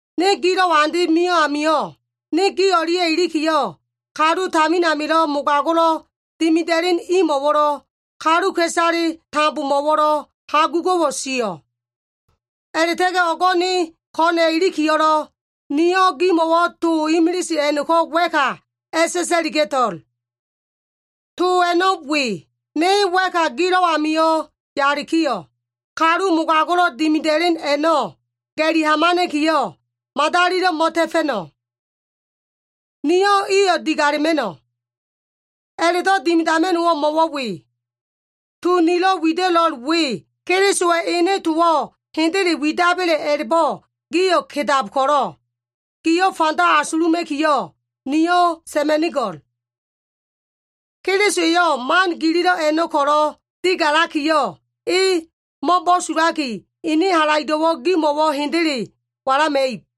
Ne gilo꞉wa andeb mio꞉ amio꞉, ne gi o꞉lia꞉ ilikiyo꞉ kalu tamin amilo꞉ mogago꞉lo꞉ dimida꞉len imo꞉wo꞉lo꞉, kaluka꞉isale tambomo꞉wo꞉lo꞉ hagugo꞉wo꞉ sio꞉. A꞉la꞉ta꞉ga꞉ o꞉go꞉ ne ko꞉na꞉ ilikiyo꞉lo꞉, niyo꞉ gimo꞉wo꞉ to imilise a꞉no꞉ko꞉ wa꞉ka a꞉sa꞉sa꞉liga꞉to꞉l. To a꞉no꞉ we. Ne wa꞉ka gilo꞉ amio꞉ yalikiyo꞉, kalu mogago꞉lo꞉ dimida꞉len a꞉no꞉ ga꞉li hamana꞉kiyo꞉, madalilo꞉ mo꞉ta꞉fa꞉no꞉. Niyo꞉ iyo꞉ digalema꞉no꞉. A꞉la꞉do꞉ dimidama꞉no꞉wo꞉ mo꞉wo꞉ we. To nilo꞉ wida꞉lo꞉l we Kelisowa꞉ ene towo꞉ hendele widaba꞉le a꞉la꞉bo꞉ gio꞉ kedab ko꞉lo꞉, gio꞉ fanda asuluma꞉kiyo꞉, niyo꞉ sa꞉ma꞉nigo꞉l. Keliso eyo꞉ man gililo꞉ a꞉no꞉ ko꞉lo꞉ digalakiyo꞉, e mo꞉bo꞉sulaki ene halaido꞉wo꞉ gimo꞉wo꞉ hendele walama꞉ib.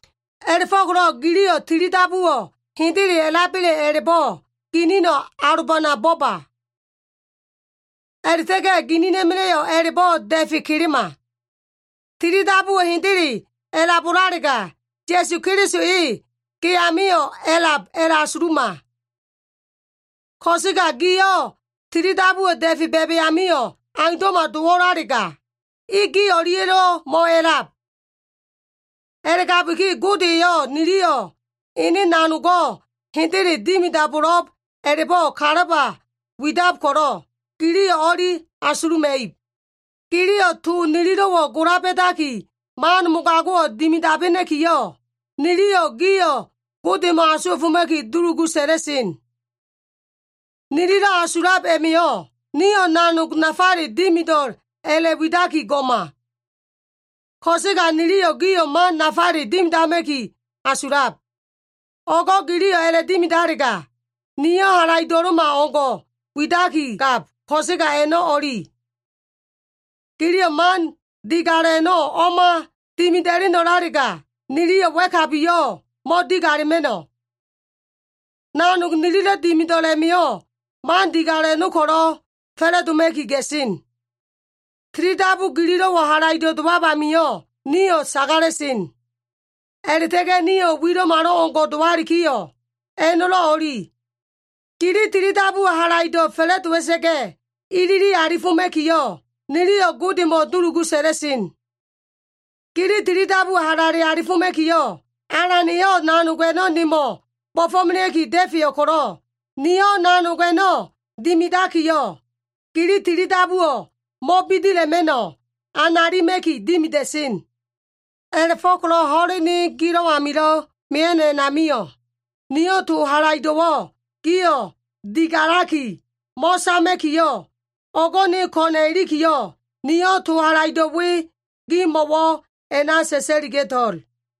A꞉la꞉fo꞉ko꞉lo꞉ giliyo꞉ tili dabuwo꞉ hendele a꞉laba꞉le a꞉la꞉bo꞉ ginino꞉ alobana boba. A꞉la꞉ta꞉ga꞉ ginina꞉ma꞉la꞉yo꞉ a꞉la꞉bo꞉ da꞉fe kelema. Tilidabuwo꞉ hendele a꞉labo꞉lalega, Ya꞉su Keliso e ge amio꞉ a꞉lab a꞉la꞉asuluma. Ko꞉sega gio꞉ tilidabuwo꞉ da꞉fe ba꞉ba꞉ amio꞉ aundo꞉ma dowo꞉lalega, E gi o꞉lia꞉lo꞉ mo꞉a꞉lab. A꞉la꞉gabiki Gode eyo꞉ niliyo꞉ ene nanogo꞉ hendele dimidabo꞉lo꞉b a꞉la꞉bo꞉ kalaba widab ko꞉lo꞉, giliyo꞉ o꞉li asuluma꞉ib. Giliyo꞉ to nililo꞉wo꞉ gola ba꞉daki man mogago꞉wo꞉ dimidabena꞉kiyo꞉, niliyo꞉ gio꞉ Godemo꞉ asuwa꞉foma꞉ki dulugu sa꞉la꞉sen. Nililo꞉ asulab a꞉ma꞉yo꞉, nio꞉ nanog nafale dimido꞉l a꞉la꞉widaki go꞉ma. Ko꞉sega niliyo꞉ gio꞉ man nafale dimidama꞉ki asulab. O꞉go꞉ giliyo꞉ a꞉la꞉dimidalega, nio꞉ halaido꞉lo꞉malo꞉ o꞉ngo꞉ widakigab ko꞉sega a꞉no꞉ o꞉li. Giliyo꞉ man digalo꞉ a꞉no꞉ o꞉ma dimida꞉leno꞉lalega, niliyo꞉ wa꞉kabiyo꞉ mo꞉digalema꞉no꞉. Nanog nililo꞉ dimido꞉l a꞉ma꞉yo꞉, man digalo꞉ a꞉no꞉ ko꞉lo꞉ fa꞉la꞉doma꞉ki ga꞉sen. Tilidabu gililo꞉wo꞉ halaido꞉ dowab amio꞉ nio꞉ sagala꞉sen. A꞉la꞉ta꞉ga꞉ nio꞉ wilo꞉malo꞉ngo꞉ dowalikiyo꞉, a꞉no꞉lo꞉ o꞉li. Gili tilidabuwo꞉ halaido꞉ fa꞉la꞉dowa꞉sa꞉ga꞉, ilili alifoma꞉kiyo꞉, niliyo꞉ Godemo꞉ dulugu sa꞉la꞉sen. Gili tilidabuwo꞉ halale alifoma꞉kiyo꞉, Alan eyo꞉ nanog a꞉no꞉ nemo꞉ bo꞉fo꞉melea꞉ki da꞉feyo꞉ ko꞉lo꞉, niyo꞉ nanog a꞉no꞉ dimidakiyo꞉, gili tilidabuwo꞉ mo꞉bidila꞉ma꞉no꞉, analima꞉ki dimida꞉sen. A꞉la꞉fo꞉ko꞉lo꞉ ho꞉len ne gilo꞉ amilo꞉ mia꞉no꞉ a꞉namio꞉, niyo꞉ to halaido꞉wo꞉ gio꞉ digalaki mo꞉sama꞉kiyo꞉, o꞉go꞉ ne ko꞉na꞉ ilikiyo꞉, niyo꞉ to halaido꞉ we gimo꞉wo꞉ a꞉na sa꞉sa꞉liga꞉to꞉l.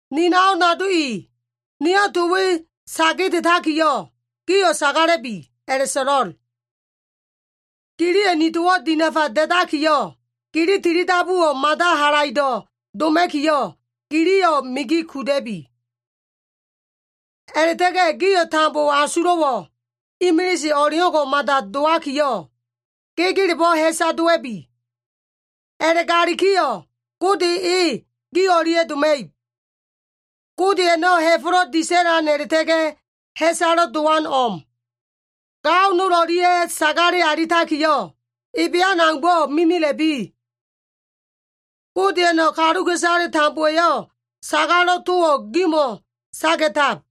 Ni nao nado i, niyo꞉ to we sa kedetakiyo꞉, gio꞉ sagala꞉bi a꞉la꞉so꞉lo꞉l. Giliyo꞉ ni towo꞉ dinafa da꞉dakiyo꞉, gili tilidabuwo꞉ mada halaido꞉ doma꞉kiyo꞉, giliyo꞉ migi kuda꞉bi. A꞉la꞉ta꞉ga꞉ gio꞉ tambo asulo꞉wo꞉ imilise o꞉leo꞉ngo꞉ mada dowakiyo꞉, gegelebo꞉ ha꞉sa dowa꞉bi. A꞉la꞉galikiyo꞉ Gode e gi o꞉lia꞉ doma꞉ib. Gode a꞉no꞉ ha꞉fo꞉lo꞉ disa꞉lan a꞉la꞉ta꞉ga꞉ ha꞉salo꞉ dowano꞉ o꞉m. Gao nol o꞉lia꞉ sagale alitakiyo꞉, ebean aumbo꞉ mimila꞉bi. Godeya꞉no꞉ kaluka꞉isale tambowa꞉yo꞉ sagalo꞉ towo꞉ gimo꞉ saga꞉tab.